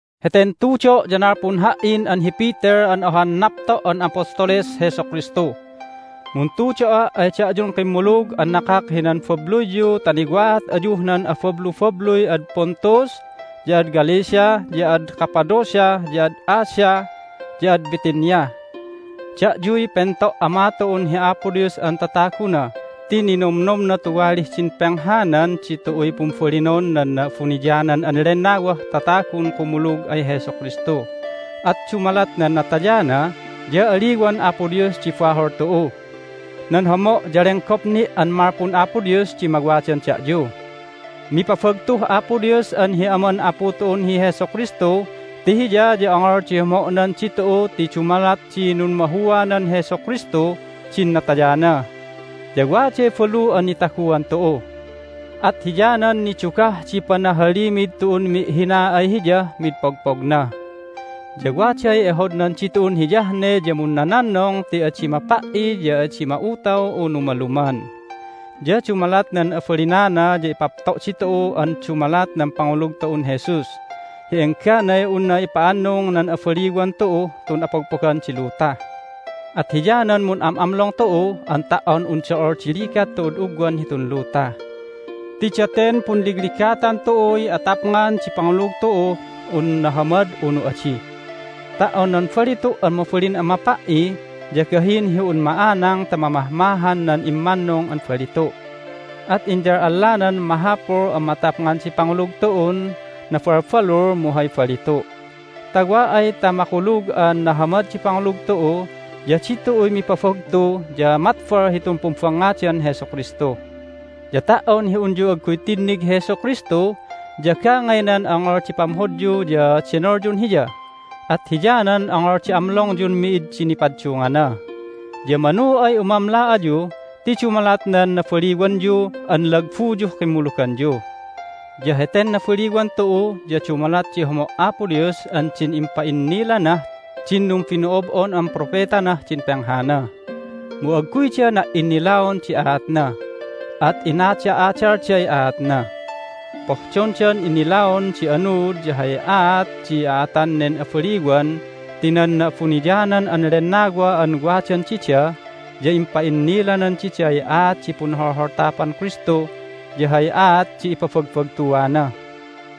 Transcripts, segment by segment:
Heten tudo' ya nalpun ha"in an hi Peter an ohan napto' an apostoles Jesu Kristu. Muntudo'a' ay da'yun kimmulug an nakak hinan babluyyu ta niwa'at ayuh nan abablubabluy ad Pontus, ya ad Galatia, ya ad Cappadocia, ya ad Asia, ya ad Bithynia. Da'yuy pento' Ama tu'un hi Apo Dios an tataguna ti ninomnomna tuwalih din penghanan ditu'uy pumbalinon nan Na'abuniyanan an Lennawah tatagun kumulug ay Jesu Kristu, at dumalat nan natayana ya aliwan Apo Dios di bahol tu'u. Nan homo' ya lenggop ni' an malpun Apo Dios di mawadan da'yu. Mipabagtuh Apo Dios an hi Aman Apu tu'un hi Jesu Kristu ti Hiya ya ongol di homo'nan ditu'u ti dumalat di nummahuanan Jesu Kristuh din natayana, ya waday balu an nitaguan tu'u. At hiyanan nidugah di panahalimid tu'un mi'hina ay Hiyah mid pogpogna. Ya waday ehodnan ditu'un hiyah ne ya munnononnong ti adi mapa"i ya adi ma'utaw unu maluman. Ya dumalat nan abalinana ya ipapto' ditu'u an dumalat nan pangulug tu'un Jesus hi engganay unna ipa'annung nan abaliwan tu'uh tun apogpogan di luta. At hiyanan mun'am'amlong tu'u an ta"on un do'ol di ligat tu'ud ugwan hitun luta. Ti daten punligligatan tu'uy atapngan di pangulug tu'uh un nahamad unu adi. Ta"on nan balitu' an mabalin an mapa"i, ya gahin hi un ma'anang ta mamahmahan nan immannung an balitu'. At inyal'allanan mahapul an matapngan di pangulug tu'un nabalbalul mu hay balitu'. Ta wa ay ta makulug an nahamad di pangulug tu'u ya ditu'uy mipabagtu ya matbal hitun pumbangngadan Jesu Kristu. Ya ta"on hi unyu agguy tinnig hi Jesu Kristu ya gangaynan ongol di pamhodyu ya denolyun Hiya, at hiyanan ongol di amlongyun mi'id di nipaddungana. Ya manu ay umamla ayu ti dumalat nan nabaliwanyu an lagbuyuh kimmuluganyu. Ya heten nabaliwan tu'u ya dumalat di homo' Apo Dios an din impa'innilanah din numbino'ob'on an propetanah din penghana. Mu agguyda na"innilaon di aatna, at inada'adalday aatna. Pohdondan innilaon di anuud ya hay aat di a'atan nen abaliwan ti nan Na'abuniyanan an Lennawa an wadan dida ya impa'innilanan diday aat di punholholtapan Kristu ya hay aat di ipabagbagtuana.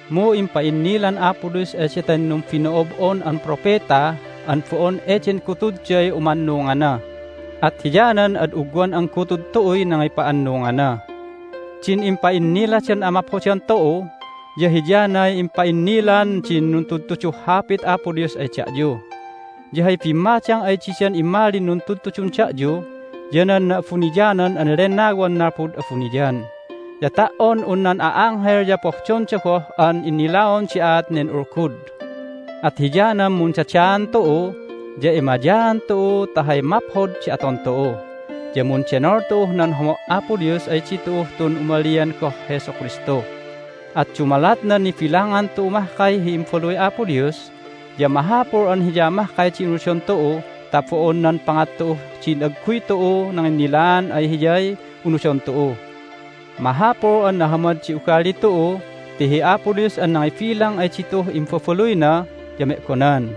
Mu impa'innilan Apo Dios ay daten numbino'ob'on an propeta an bo'on eden gutudday umannungana, at hiyanan ad ugwan an gutud tu'uy nangipa'annungana. Din impa'inniladan amaphodan tu'u ya hiyanay impa'innilan din nuntudtuduh Hapit Apo Dios ay da'yu. Ya hay bimmadang ay didan immalin nuntudtudun da'yu ya nan Na'abuniyanan an Lennawan nalpud abuniyan. Ya ta"on un nan a'anghel ya pohdonda goh an innilaon di aat nen ulgud. At hiyanan mundadaan tu'u, ya emayaan tu'u ta hay maphod di aton tu'u, ya mundenol tu'uh nan homo' Apo Dios ay ditu'uh tun umalian goh Jesu Kristu. At dumalat nan nibilangan tu'u mahkay hi imbabaluy Apo Dios ya mahapul an Hiya mahkay di unudon tu'u ta bo'on nan pangat tu'uh din agguy tu'u nanginnilaan ay Hiyay unudon tu'u. Mahapul an nahamad di ugali tu'u ti hi Apo Dios an nangibilang ay ditu'uh imbabaluyna ya me'gonan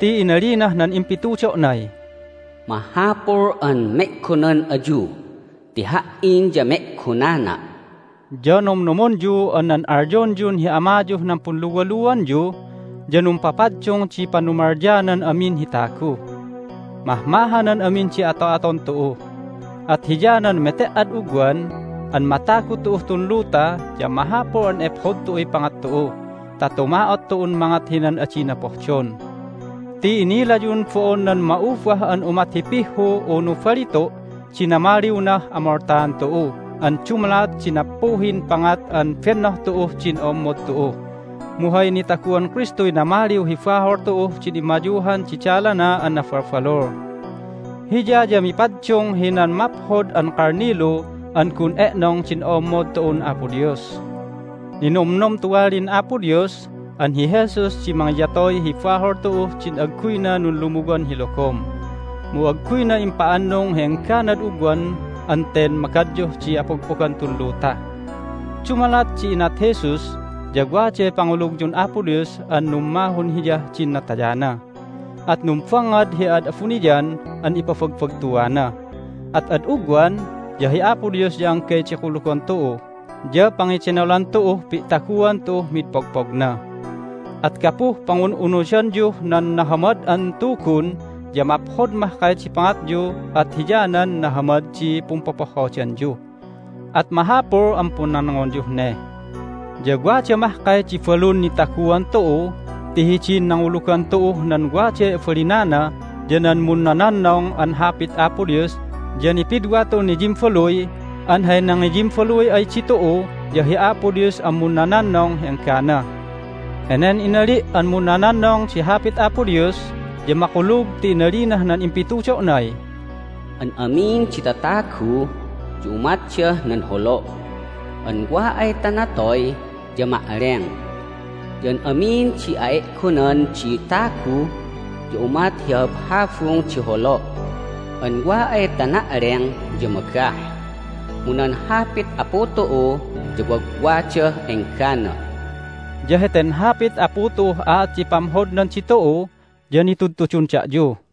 ti inalinah nan impitudo'nay, "Mahapul an me'gonan ayu ti Ha"in ya me'gonana'." Ya nomnomonyu an nan alyonyun hi Amayuh nan punluwaluanyu ya numpapaddung di panumalyanan amin hi tagu. Mahmahanan amin di ato'aton tu'u, at hiyanan mete"ad ugwan an matagu tu'uh tun luta ya mahapul an ephod tu'uy pangat tu'u ta tuma'ot tu'un mangat hinan adina pohdon. Ti inilayun bo'on nan ma'ubah an umat hi pihhu unu balitu' di namaliwnah amoltaan tu'u an dumalat di nappuhin pangat an bennoh tu'uh din o'ommod tu'u, mu hay nitaguan Kristuy namaliw hi bahol tu'uh din immayuhan di dalana an nabalbalul. Hiya ya mipaddung hinan maphod an kalnilu an gun e'nong din o'ommod tu'un Apo Dios. Ninomnom tuwalin Apo Dios an hi Jesus di mangiyatoy hi bahol tu'uh din agguyna nunlumuwan hi logom. Mu agguyna impa'annung hi engganad ugwan an ten magadyuh di apogpogan tun luta. Dumalat di inat Jesus ya waday pangulugyun Apo Dios an nummahun Hiyah din natayana, at numbangngad hi ad abuniyan an ipabagbagtuana. At ad ugwan ya hi Apo Dios ya anggay di kulugon tu'u ya pangedenolan tu'uh pi'taguan tu'uh mid pogpogna. At gapuh pangun'unudanyuh nan Nahamad an Tugun ya maphod mahkay di pangatyu at hiyanan nahamad di pumpopohhodanyu. At mahapul an punnonngonyuh ne. Ya wada mahkay di balun nitaguan tu'u ti hidin nangulugan tu'uh nan waday abalinana ya nan munnononnong an Hapit Apo Dios ya nipidwa tu'un niyimbaluy an hay nangiyimbaluy ay ditu'u ya hi Apo Dios an munnononnong hi enggana. Henen inali' an munnononnong di Hapit Apo Dios ya makulug ti inalinah nan impitudo'nay, "An amin di tatagu ya umatdah nan holo' an wa ay ta natoy ya ma'leng. Ya an amin di a'e'gonan di tagu ya umat hi habhabung di holo' an wa ay ta na'leng ya magah. Mu nan Hapit Apu tu'u ya wagwadah enggana." Ya heten Hapit Apu tu'uh aat di pamhodnan ditu'u ya nitudtudun da'yu.